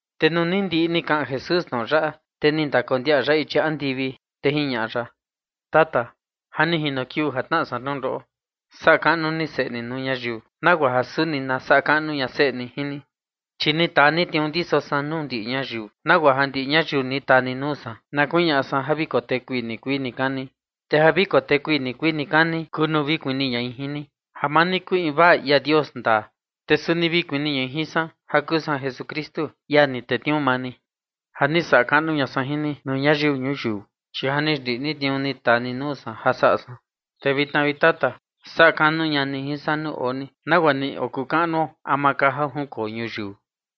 Te nuu ni ndiꞌi ni kaꞌan Jesús tnoꞌo yaꞌa, te ni ndakondiaꞌa ya ichi andivi, te jiñaꞌa ya: ―Tata, ja ni jino kiuu ja tnaꞌa san tnundoꞌo. Saꞌa kaꞌnu ni Seꞌe ni nuu ñayiu nagua ja suni na saꞌa kaꞌnu ña Seꞌe ni jin ni. Chi ni taa ni tniuu ndiso san nuu ndiꞌi ñayiu, nagua ja ndiꞌi ñayiu ni taa ni nuu san na kuñaꞌa san ja vi kotekui nikuii nikani. Te ja vi kotekui nikuii nikani kuu nuu vi kuni ñai jin ni, ja maa ni kuu invaa ia Dios ndaa, te suni vi kuni ñai jin san ja kuu san Jesukristu, ia ni tetniuu maa ni. Ja ni saꞌa kaꞌnu ña san jin ni nuu ñayiu ñuyiu, chi ja ni xndiꞌi san tniuu ni taa ni nuu san ja saꞌa san. Te vitna, vi Tata, saꞌa kaꞌnu ña ni jin san nuu oo ni, nagua ni ka okuu kaꞌnuo ama ka ja junkoo ñuyiu.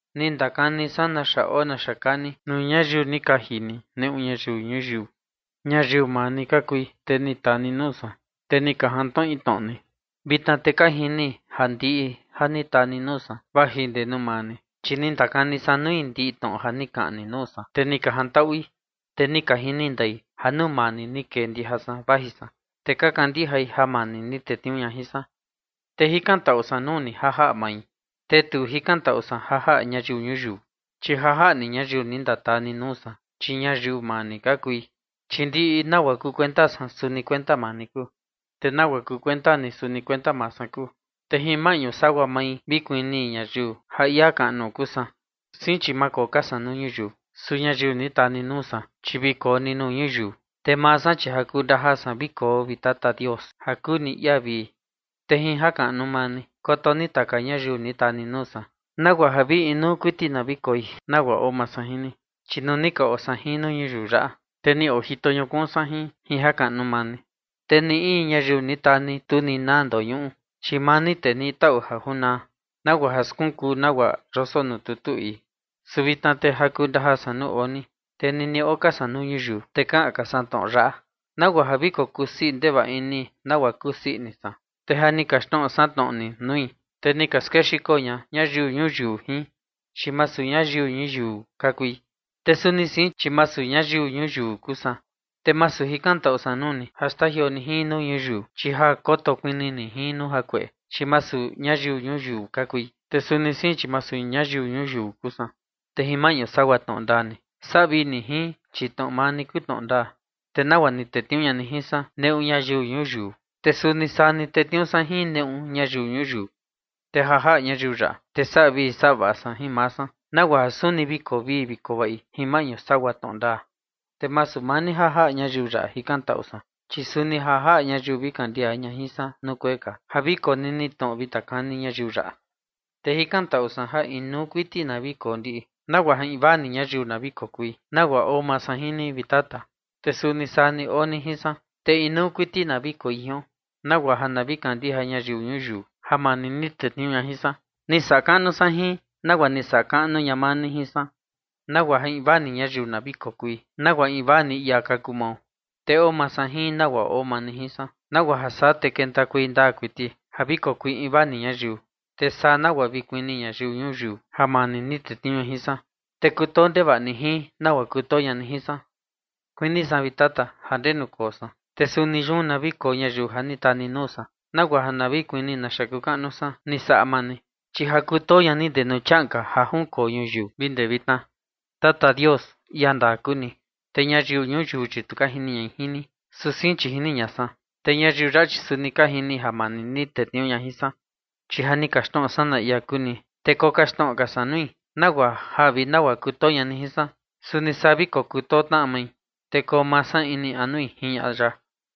’Ni ndakani san naxa oo naxa kaa ni, nuu ñayiu ni kaji ni neꞌu ñayiu ñuyiu. Ñayiu maa ni ka kui, te ni taa ni nuu san, te ni ka jantnoꞌi tnoꞌo ni. Vitna te ka jini ja ndiꞌi ja ni taa ni nuu san vaji ndee nuu maa ni. Chi ni ndakani san nui ndiꞌi tnoꞌo ja ni kaꞌan ni nuu san, te ni ka jantaꞌui. Te ni ka jini ndai ja nuu maa ni ni kee ndija san vaji san, te ka kandijai ja maa ni ni tetniuu ña jin san. ’Te jikantaꞌu san nuu ni ja jaꞌa mai. Te tu jikantaꞌu san ja jaꞌa ñayiu ñuyiu, chi ja jaꞌa maa ni ñayiu ni ndataa ni nuu san, chi ñayiu maa ni ka kui. Chi ndiꞌi nagua kuu kuenta san, suni kuenta maa ni kuu. Te nagua kuu kuenta ni, suni kuenta maa san kuu. Te jin maꞌñu sagua mai vi kuni ñayiu ja ia kaꞌnu kuu san. Sein, chi maa koo ka san nuu ñuyiu, su ñayiu ni taa ni nuu san, chi vi koo ni nuu ñuyiu. Te maa san, chi ja kuu ndajaa san vi koo, vi Tata Dios, ja kuu ni ia vii. Te jin jakaꞌnu maa ni koto ni taka ñayiu ni taa ni nuu san, nagua ja vi inuu kuiti na vi koi, nagua oo maa san jin ni. Chi nuu ni ka oo san jin nuu ñuyiu yaꞌa, te ni ojito ñukuun san jin, jin jakaꞌnu maa ni. Te ni in ñayiu ni taa ni, tu ni naa ndoñuꞌu, chi maa ni tee niꞌi taꞌu ja junaa, nagua ja skunkuu nagua yoso nuu tutu ii. Su vitna te ja kuu ndajaa san nuu oo ni, te nini oo ka san nuu ñuyiu, te kaꞌan ka san tnoꞌo yaꞌa, nagua ja na vi kokusii ndevaꞌa ini, nagua kusii ini san. Te ja ni kaxtnoꞌo san tnoꞌo ni nui, te ni ka skexiko ña ñayiu ñuyiu jin, chi masu ñayiu ñuyiu ka kui. Te suni sein, chi masu ñayiu ñuyiu kuu san. Te masu jikantaꞌu san nuu ni ja xtajioo ni jin nuu ñuyiu, chi ja koto kuni ni jin nuu jakueꞌe. Chi masu ñayiu ñuyiu ka kui, te suni sein, chi masu ñayiu ñuyiu kuu san. Te jin maꞌñu sagua tnoꞌo ndaa ni, saꞌa vii ni jin, chi tnoꞌo maa ni kuu tnoꞌo ndaa. Te nagua ni tetniuu ña ni jin san neꞌu ñayiu ñuyiu, te suni saa ni tetniuu san jin neꞌu ñayiu ñuyiu. Te ja jaꞌa ñayiu yaꞌa, te saꞌa vii saꞌa vaꞌa san jin maa san, nagua ja suni vi koo vii vi koo vaꞌi jin maꞌñu sagua tnoꞌo ndaa. ’Te masu maa ni ja jaꞌa ñayiu yaꞌa jikantaꞌu san, chi suni ja jaꞌa ñayiu vi kandija ña jin san nuu kuee ka ja vi konini tnoꞌo vi ndakani ñayiu yaꞌa. Te jikantaꞌu san ja inuu kuiti na vi koo ndiꞌi, nagua ja invaa ni ñayiu na vi kokui, nagua oo maa san jin ni, vi Tata, te suni saa ni oo ni jin san. Te inuu kuiti na vi koi jion, nagua ja na vi kandija ñayiu ñuyiu ja maa ni ni tetniuu ña jin san. Ni saꞌa kaꞌnu san jin, nagua ni saꞌa kaꞌnu ña maa ni jin san, nagua ja invaa ni ñayiu na vi kokui, nagua invaa ni ia ka kuu mao. Te oo maa san jin, nagua oo maa ni jin san, nagua ja saa, te kentakuei ndaa kuiti ja vi kokui invaa ni ñayiu, te saa nagua ja vi kuni ñayiu ñuyiu ja maa ni ni tetniuu ña jin san, te kutoo ndevaꞌa ni jin, nagua kutoo ña ni jin san. ’Kuini san, vi Tata, ja ndenu koo san, te suni yun na vi koo ñayiu ja ni taa ni nuu san, nagua ja na vi kuni naxa kuu kaꞌnu san ni saꞌa maa ni. Chi ja kutoo ña ni guaa ndee nuu chiaꞌan ka ja junkoo ñuyiu vi guaa ndee vitna. Tata Dios, ia ndaa kuu ni, te ñayiu ñuyiu, chi tu ka jini ñai jin ni, su sein chi jini ña san. Te ñayiu yaꞌa, chi suni ka jini ja maa ni ni tetniuu ña jin san. Chi ja ni kaxtnoꞌo san na ia kuu ni, te kokaxtnoꞌo ka san nui, nagua ja vi nagua kutoo ña ni jin san, suni saa vi kokutoo tnaꞌa mai, te koo maa san ini anui ―jiñaꞌa ya.